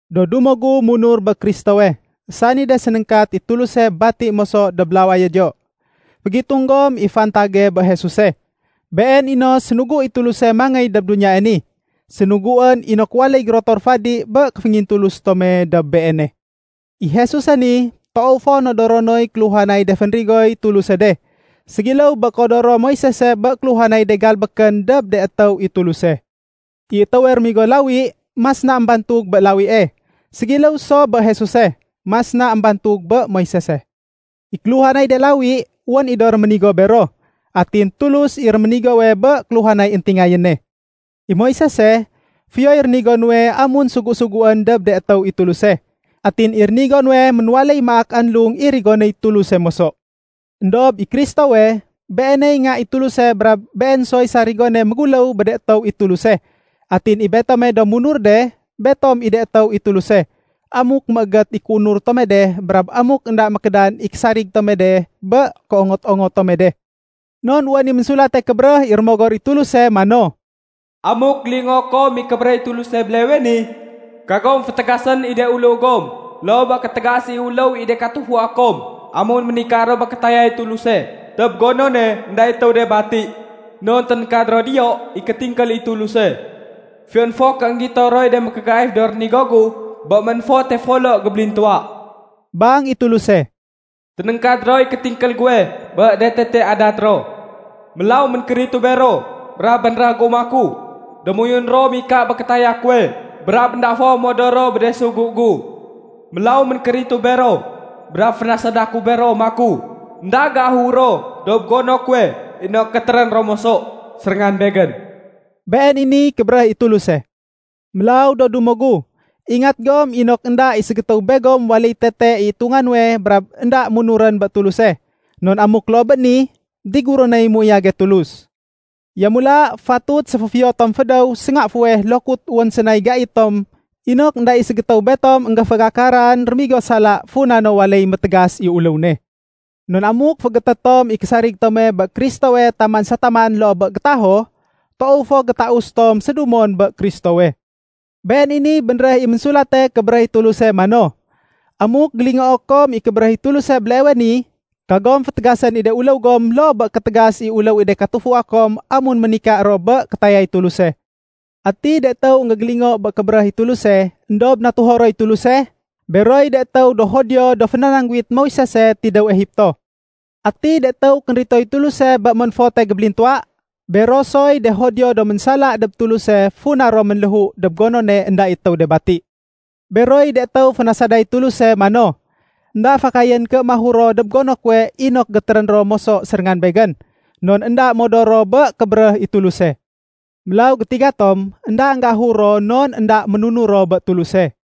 Do dumo gu do munur bé Kristowe, sani de sénéngkat i Tuluse bati moso dob lawayo diyo, fégitung gom i fantage bé Jesuse. Been i no sénugu i Tuluse mangéy dob duniyae ni. Sénuguén inok waléy gérotor fadi bé kéféngintulus tome dob Beene. I Jesuse ni, toow fo nodoro noy kéluhanay de fénrigoy Tuluse de, ségiléw bé kéodoro Moisese bé kéluhanay de galbékén dob de étéw i Tuluse. I étéwe rémigo lawi, mas na émbantug bé lawie. Ségiléw so bé Jesuse, mas na émbantug bé Moisese. I kéluhanay de lawi, wén i do réménigo bero. Atin Tulus i réménigowe bé kéluhanay éntingayéne. I Moisese, fiyoy rénigo nuwe amun sugu-suguén dob de étéw i Tuluse. Atin i rénigo nuwe ménwaléy maak anlung i rigonéy Tuluse moso. Endob i Kristowe, Beeney Nga i Tuluse brab Been soy sarigone méguléw bé de étéw i Tuluse. Atin i betome do munur de, betom i de étéw i Tuluse, amuk méégét i kéunur tome de brab amuk énda mékédan i késarig tome de bé kéongot-ongot tome de. Non wén i Ménsulate Kébéréh i Rémogor i Tuluse mano, “Amuk gélingoo kom i kébéréh i Tuluse béleewe ni, kagom fétégasén i de uléw gom loo bé kétégas i uléw i de katufua kom amun ménika ro bé kétayay Tuluse dob gonone énda i étéw de bati. Non ténéngkad ro diyo i kétingkél i Tuluse. Fiyon fo ké énggito roy de mékégaif do rénigo gu bé ménfote folo gébélintuwa,” bang i Tuluse, “ténéngkad roy kétingkél guwe bé de tete adat ro. Mélaw ménkéritu bero brab bénréh gu maku, ‘Démoyun ro mika bé kétaya kuwe brab énda fo modor ro bé de sugu gu.’ Mélaw ménkéritu bero, brab fénasada ku bero maku, ‘Enda géahur ro dob gono kuwe inok gétérén ro moso séréngan Begén.’” Been i niy kébéréh i Tuluse. Mélaw, do dumo gu, ingat gom inok énda i ségétéw begom waléy tete i itunga nuwe brab énda munurén bé Tuluse. Non amuk loo bé ni, diguré noy méuyage Tulus. Yamula, fatut séféfiyo tom fédéw sénga fuweh lokut wén sénay gai tom inok énda i ségétéw betom énggéfégakaran rémigo sala funa no waléy métégas i uléw ne. Non amuk féégété tom i késarig tome bé Kristowe taman sa taman loo bé gétaho, toow fo gétaus tom sédumon bé Kristowe. Been i niy bénréh i Ménsulate Kébéréh i Tuluse mano, “Amuk gélingoo kom i kébéréh i Tuluse béleewe ni, kagom fétégasén i de uléw gom loo bé kétégas i uléw i de katufua kom amun ménika ro bé kétayay Tuluse.” Ati de étéw énggégélingo bé kébéréh i Tuluse, éndob natuho roy Tuluse? Beroy de étéw do Judio do fénanangguwit Moisese tidéw Egipto. Ati de étéw kénritoy Tuluse bé ménfote gébélintuwa? Bero soy de Judio do ménsala dob Tuluse funa ro ménléhu dob gonone énda i étéw de bati. Beroy de étéw fénasaday Tuluse mano, “Enda fakayén ké mahur ro dob gono kuwe inok gétérén ro moso séréngan Begén.” Non énda modor ro bé kébéréh i Tuluse. Mélaw gétiga tom énda énggéahur ro non énda ménunur ro bé Tuluse.